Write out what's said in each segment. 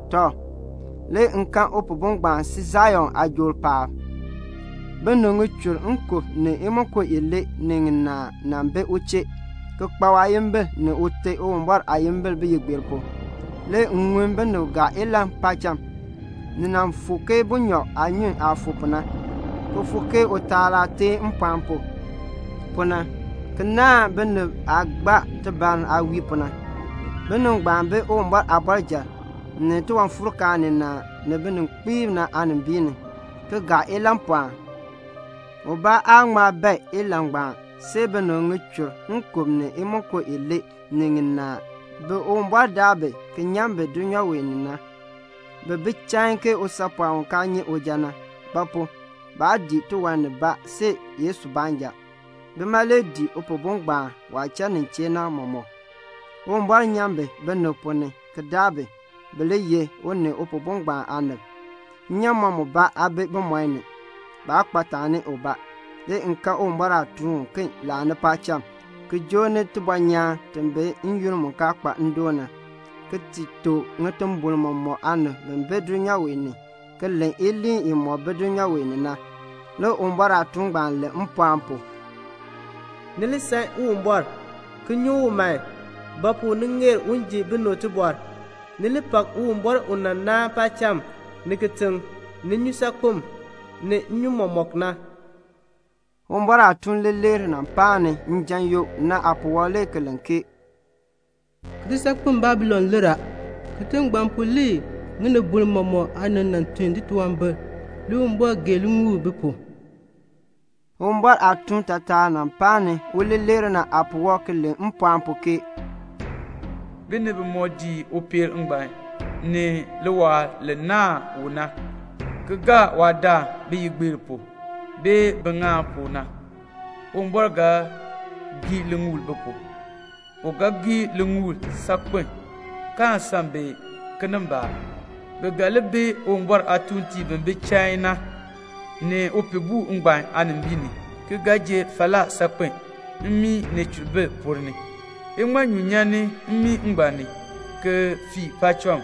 Tɔ, le m kan Upihbo ngbaan si Sion aajool paab. Binib ŋichur nkub ni imonko ilee ni ŋinaa bi u chee, ki kpa waayimbil ni Ute Uwumbɔr aayimbil biyigbeer pu. Le m ŋun binib gaa ilahn paacham. Ni fuuk ke bunyɔb aanyun aah fuuk pu na, ki fuuk ke utaal aah teen mpɔɔn pu, pu na, ki naahn binib aah gbaa tibar aah wii pu na. Binib ngbaan bi Uwumbɔr aabɔrjal, ni tiwanfuurkaan ninaa, ni bininkpiib aanimbiin ni, ki gaa ilahnpɔɔn. Ubaa aan ŋma bae nlahn ngbaan see binib ŋichur nkub ni imonko ilee ni ŋinaa ngbaan bi Uwumbɔr daa bi ki nyan bi dulnyaa wee ni na. Bi bi chain ke usaapɔɔn u kaa nyi uja na; ba pu? baa dii tiwan nibaa see Yesu baanja. Bima le dii Upihbo ngbaan waah cha nin chee na mɔmɔk. Uwumbɔr nyan bi binib ponn ni ki daa bi, bi li ye u ni Upihbo ngbaan aanib. Nnyaamɔn mubaa aa bi bimɔi ni. Baa kpa taani ubaa. Le m kan Uwumbɔr aatuun uken laani paacham, ki joo ni tibɔnyaan ti bi n-yoonn mu kaa kpa ndoon na, ki ti tuk ŋitimbol mɔmɔk aanib bi bi dulnyaa wee ni ki len iliin imɔk bi dulnyaa wee ni na. Le Uwumbɔr aatuun ngbaan len mpɔɔn pu, "Ni li san Uwumbɔr, ki nyuŋ u man; ba pu? ni ŋeer un ji binib tibɔr. Ni li pak Uwumbɔr u nan naan paacham, ni kitiŋ, ni nnyusaakpem, ni nnyun mɔmɔk na." Le Uwumbɔr aatuun leeler mu paan njan yoo aapuwɔb le ki len ke "Kitisaakpeŋ Babilon lir a. Kitiŋ ngbaan pu le ŋinibol mɔmɔk aanib nan tun titunwambir. Le Uwumbɔr gee liŋuul bi pu." Le Uwumbɔr aatuun taatar mu paan uleeler aapuwɔb le ki len mpɔɔn pu ke "Binib bimɔk dii upeel ngbaan ni liwaal li naahn u na ki gaa waadaan biyigbeer pu, bee biŋaal pu na, Uwumbɔr ga gee liŋuul bi pu. U ga gee liŋuul saakpen kaan san bi kinimbaak. Bi ga li bi Uwumbɔr aatuuntiib bi bi chain na, ni Upihbo ngbaan aanimbiin ni, ki ga ji falaa saakpen mmii ni cheribir ponn ni. Iŋmanyu nyan mmii ngbaan ni ki fii paacham.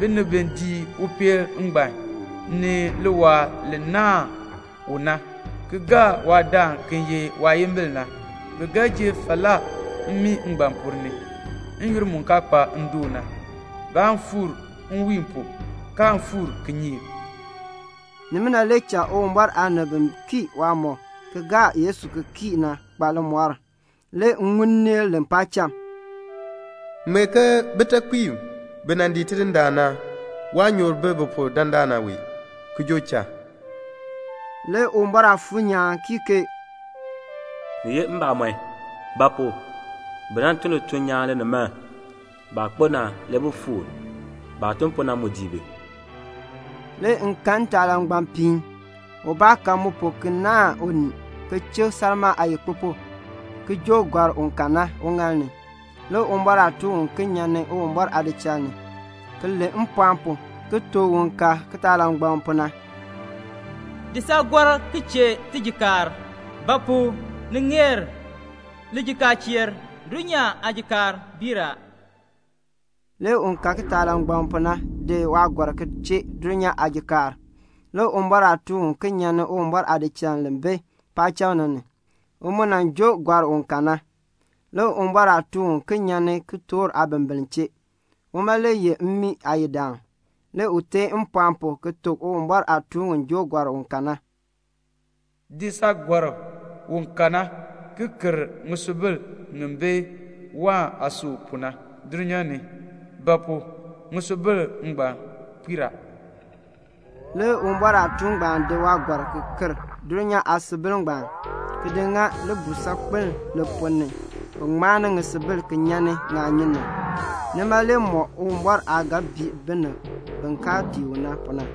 Binib bi dii upeel ngbaan ni liwaal li naahn u na, ki gaa waadaan ki ye waayimbil na, bi ga ji falaa mmii ngbaan ponn ni n-yoonn mu kaa kpa ndoon na. Baan fuur nwiin pu, kaan fuur kinyeek." Nima le cha Uwumbɔr aanib bi kii waamɔb ki gaa Yesu ki kii na kpa limɔr. Le m ŋun nneel len paacham, "Ŋmee ke: Bitekpiib bi nan dii Tidindaan na, waanyoor bi bi pu dandana wee ki joo cha." Le Uwumbɔr Aafuur nyaan kii ke "Ni ye mbamɔn; ba pu? bi nan tun lituln nyaan linimaln. Baah kpo na, le bi fuur. Baah tun pu na mu dii bi." Le m kan ntaalangbapiin. Ubaa ka mu pu ki naahn unii, ki chik salmaa aayikpupuk, ki joo gɔrk u ka na uŋaal ni. Le Uwumbɔr aatuun uken nyan Uwumbɔr aadichal ni, ki len mpɔɔn pu ki tuk un ka kitaalangbaŋ pu na, "Di saagɔrk ki chee tijikaar; ba pu? ni ŋeer lijikaacheer. Dulnyaa aajikaar biir a." Le un ka kitaalangbaŋ pu na di waagɔrk ki chee dulnyaa aajikaar. Le Uwumbɔr aatuun uken nyan Uwumbɔr aadichal li bi paacham na. U mu joo gɔrk u ka na. Le Uwumbɔr aatuun uken nyan kitork aabimbiln chee. Uma le ye mmii aayidaan. Le u teen mpɔɔn pu ki tuk Uwumbɔr aatuun u joo gɔrk u ka na, "Di saagɔrk u ka na ki ker ŋisubil ŋi bi wain aasui pu na dulnyaa ni; ba pu? ŋisubil ngbaan puir a." Le Uwumbɔr aatuun ngbaan di waagɔrk ki ker dulnyaa aasubil ngbaan, ki di ŋa libuul saakpeln li ponn ni bi taar ŋisubil ki nyan ni ŋaanyun na. Nima le mɔk Uwumbɔr aah ga bii binib bi kaa dii u na pu na.